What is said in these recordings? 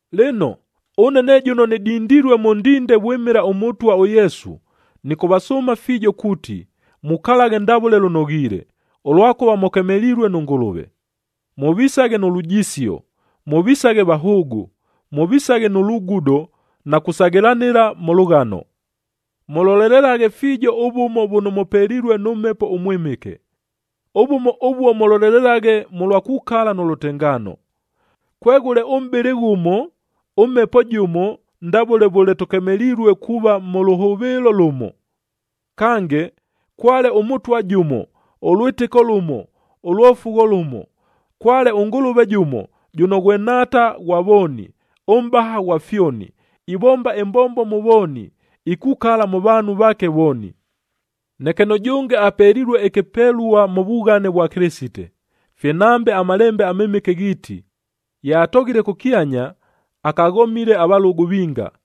Lɨno, ʉne ne jʉno nɨdindilue mʉ ndinde vwɨmɨla ʉMʉtwa ʉYesu, nɨkʉvasʉʉma fiijo kuuti, mukalaghe ndavʉle lʉnoghiile, ʉlwakʉva mʉkemelilue nʉ Ngʉlʉve. Mʉvisaghe nʉ lujisio, mʉvisaghe vahʉʉgʉ, mʉvisaghe nʉ lugudo na kusaghɨlanɨla mʉ lʉghano. Mʉlolelelaghe fiijo ʉvʉmo vʉno mʉpelilue nʉ Mhepo ʉMwɨmɨke. Ʉvʉmo ʉvuo mʉlolelelaghe mʉlwa kukala nʉ lʉtengaano. Kweghʉle ʉmʼbɨlɨ ghʉmo, ʉMhepo jʉmo ndavʉle vʉle tʉkemelilue kuuva mʉ lʉhʉvɨɨlo lʉmo. Kange, kwale ʉMʉtwa jʉmo, ʉlwɨtɨko lʉmo, ʉlwofugho lʉmo. Kwale ʉNgʉlʉve jʉmo, jʉno ghwe Nhaata ghwa vooni, mʼbaha ghwa fyoni, ivomba ɨmbombo mʉ vooni, ikukala mʉ vaanhu vaake vooni. Neke nʉjʉnge apelilue ɨkɨpelua mʉ vughane vwa Kɨlɨsite. Fye nambe aMalembe aMɨmɨke ghiiti, “Ye atoghile kʉkyanya, akaghomile avalʉgʉ vinga.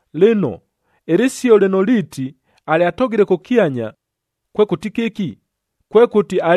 Lɨno, ɨlɨsio lɨno liiti, “Alyatoghile kʉkyanya,” kwekʉti kɨki? Kwekʉti,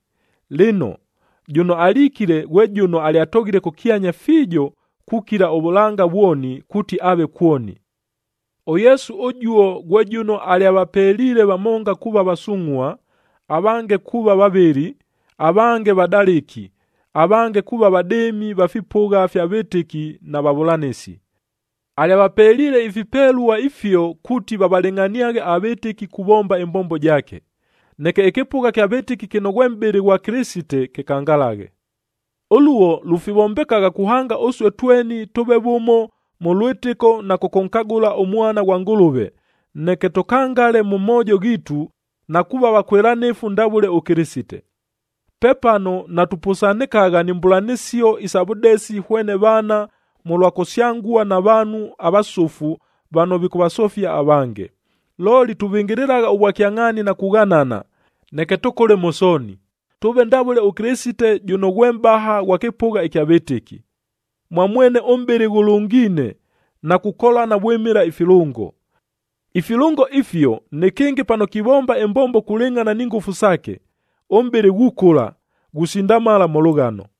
Lɨno, jʉno alikile ghwe jʉno alyatoghile kʉkyanya fiijo kukila ʉvʉlanga vwoni kuuti aave kwoni. ɄYesu ʉjuo ghwe jʉno alyavapeliile vamonga kuuva vasungʼhua, avange kuuva vavɨli, avange vadalɨki, avange kuuva vadɨɨmi va fipʉgha fya vɨtɨki na vavʉlanɨsi. Alyavapeliile ifipelua ifio kuuti vavalɨngʼhaniaghe avɨtɨki kuvomba ɨmbombo jaake, neke ɨkɨpʉgha ɨkya vɨtɨki kɨno ghwe mʼbɨlɨ ghwa Kɨlɨsite kɨkangalaghe. Ʉluo lufivombekagha kuhanga ʉsue tweni tʉʉve vʉmo mʉ lwɨtɨko na kʉkʉnkagʉla ʉMwana ghwa Ngʉlʉve, neke tʉkangale mʉ moojo ghiitu na kuuva vakwɨlanɨfu ndavʉle ʉKɨlɨsite. Pepano natupʉsanɨkagha ni mbʉlanɨsio isa vʉdesi hwene vaana mʉlwa kusyangua na vaanhu avasʉfu vano vikʉvasofia avange. Looli tuvɨngɨlɨlagha ʉvwakyangʼhaani na kughanana, neke tʉkʉle mʉ sooni, tʉʉve ndavʉle ʉKɨlɨsite jʉno ghwe mʼbaha ghwa kɨpʉgha kya vɨtɨki. Mwa mwene ʉmʼbɨlɨ ghʉlʉngiine na kukolana vwɨmɨla ifilʉngo. Ifilʉngo ifio nɨkɨngɨ pano kivomba ɨmbombo kulɨngʼhana ni ngʉfu saake, ʉmʼbɨlɨ ghukʉla, ghusindamala mʉ lʉghano.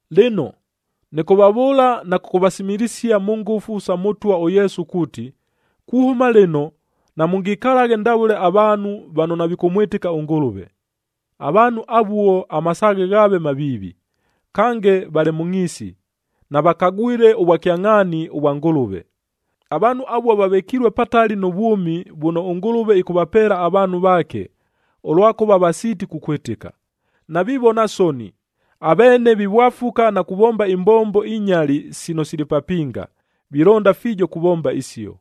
Lɨno, nɨkʉvavʉʉla na kʉkʉvasimilisia mʉ ngʉfu sa Mʉtwa ʉYesu kuuti, kuhʉma lɨno namʉngikalaghe ndavʉle avaanhu vano navikʉmwɨtɨka ʉNgʉlʉve. Avaanhu avuo, amasaaghe ghaave maviivi, kange valɨ mʉ ngʼhiisi, navakagwile ʉvwakyangʼhaani vwa Ngʉlʉve. Avaanhu avuo vavɨkilue patali nʉ vwʉmi vʉno ʉNgʉlʉve ɨkʉvapeela avaanhu vaake, ʉlwakʉva vasiiti kukwɨtɨka. Navivona soni, aveene vivwafuka na kuvomba imbombo inyali sino sili papinga. Vilonda fiijo kuvomba isio.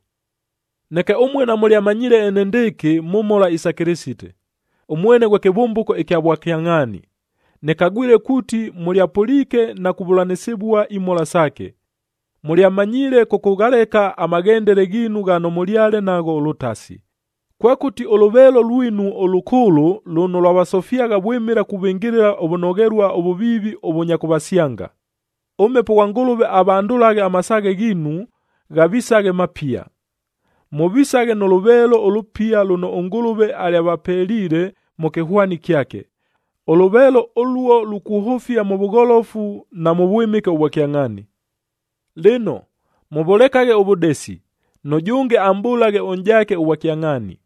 Neke ʉmue namʉlyamanyiile enendɨɨkɨ mʉ mhola isa Kɨlɨsite. Ʉmwene ghwe kɨvʉmbʉko ɨkya vwakyangʼhaani. Nɨkagwile kuuti mʉlyapʉliike na kuvʉlanɨsɨvua imhola saake. Mʉlyamanyiile kʉkʉghaleka amaghendele ghiinu ghano mʉlyale nagho ʉlʉtasi, kwekʉti ʉlʉveelo lwinu ʉlʉkʉʉlʉ lʉno lwavasofyagha vwɨmɨla kuvɨngɨlɨla ʉvʉnoghelua ʉvʉviivi ʉvʉnya kʉvasyanga. ɄMhepo ghwa Ngʉlʉve avandʉlaghe amasaaghe ghiinu ghavisaghe mapia. Mʉvisaghe nʉ lʉveelo ʉlʉpia lʉno ʉNgʉlʉve alyapelile mʉ kɨhwani kyake, ʉlʉveelo ʉluo lukuhʉfia mʉ vʉgholofu, na mʉ vwɨmɨke ʉvwa kyangʼhaani. Lɨno, mʉvʉlekaghe ʉvʉdesi, nʉjʉnge amʼbʉlaghe ʉnʼjaake ʉvwakyangʼhaani,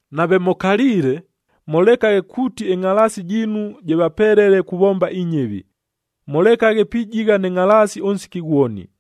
Nave mʉkaliile, mʉlekaghe kuuti ɨngʼhalaasi jiinu jɨvapelele kuvomba inyɨvi.d Mʉlekaghe pijigha nɨ ngʼhalaasi ʉnsiki ghwoni.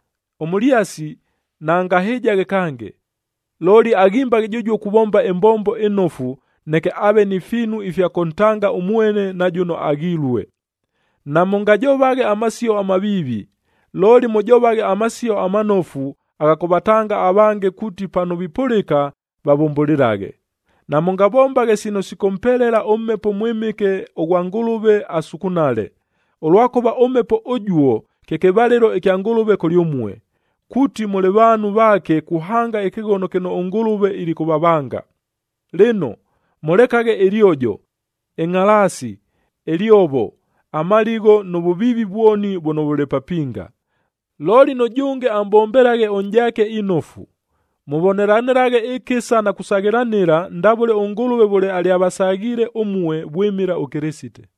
Ʉmʉlyasi, naangahɨjaghe kange, looli aghimbaghe jʉjuo kuvomba ɨmbombo ɨnofu, neke aave ni fiinu ifya kʉntanga ʉmwene na jʉno aghilue. Namʉngajovaghe amasio amaviivi, looli mʉjovaghe amasio amanofu agha kʉvatanga avange kuuti pano vipʉlɨka, vavʉmbʉlɨlaghe. Namʉngavombaghe sino sikʉmpelela ʉMhepo ʉMwɨmɨke ʉghwa Ngʉlʉve asukunale, ʉlwakʉva ʉMhepo ʉjuo, kye kɨvalɨlo kya Ngʉlʉve kʉlyʉmue, kuuti mʉlɨ vaanhu vaake kuhanga ɨkɨghono kɨno ʉNgʉlʉve ilikʉvavanga. Lɨno, mʉlekaghe ɨlyojo, ɨngʼhalaasi, ɨlyovo, amaligho nʉ vʉviivi vwoni vʉno vʉlɨ papinga. Looli nʉjʉnge amʼbombelaghe ʉnʼjaake inofu, mʉvonelanɨlaghe ɨkɨsa na kusaghɨlana ndavʉle ʉNgʉlʉve vʉle alyavasaghiile ʉmue vwɨmɨla ʉKɨlɨsite.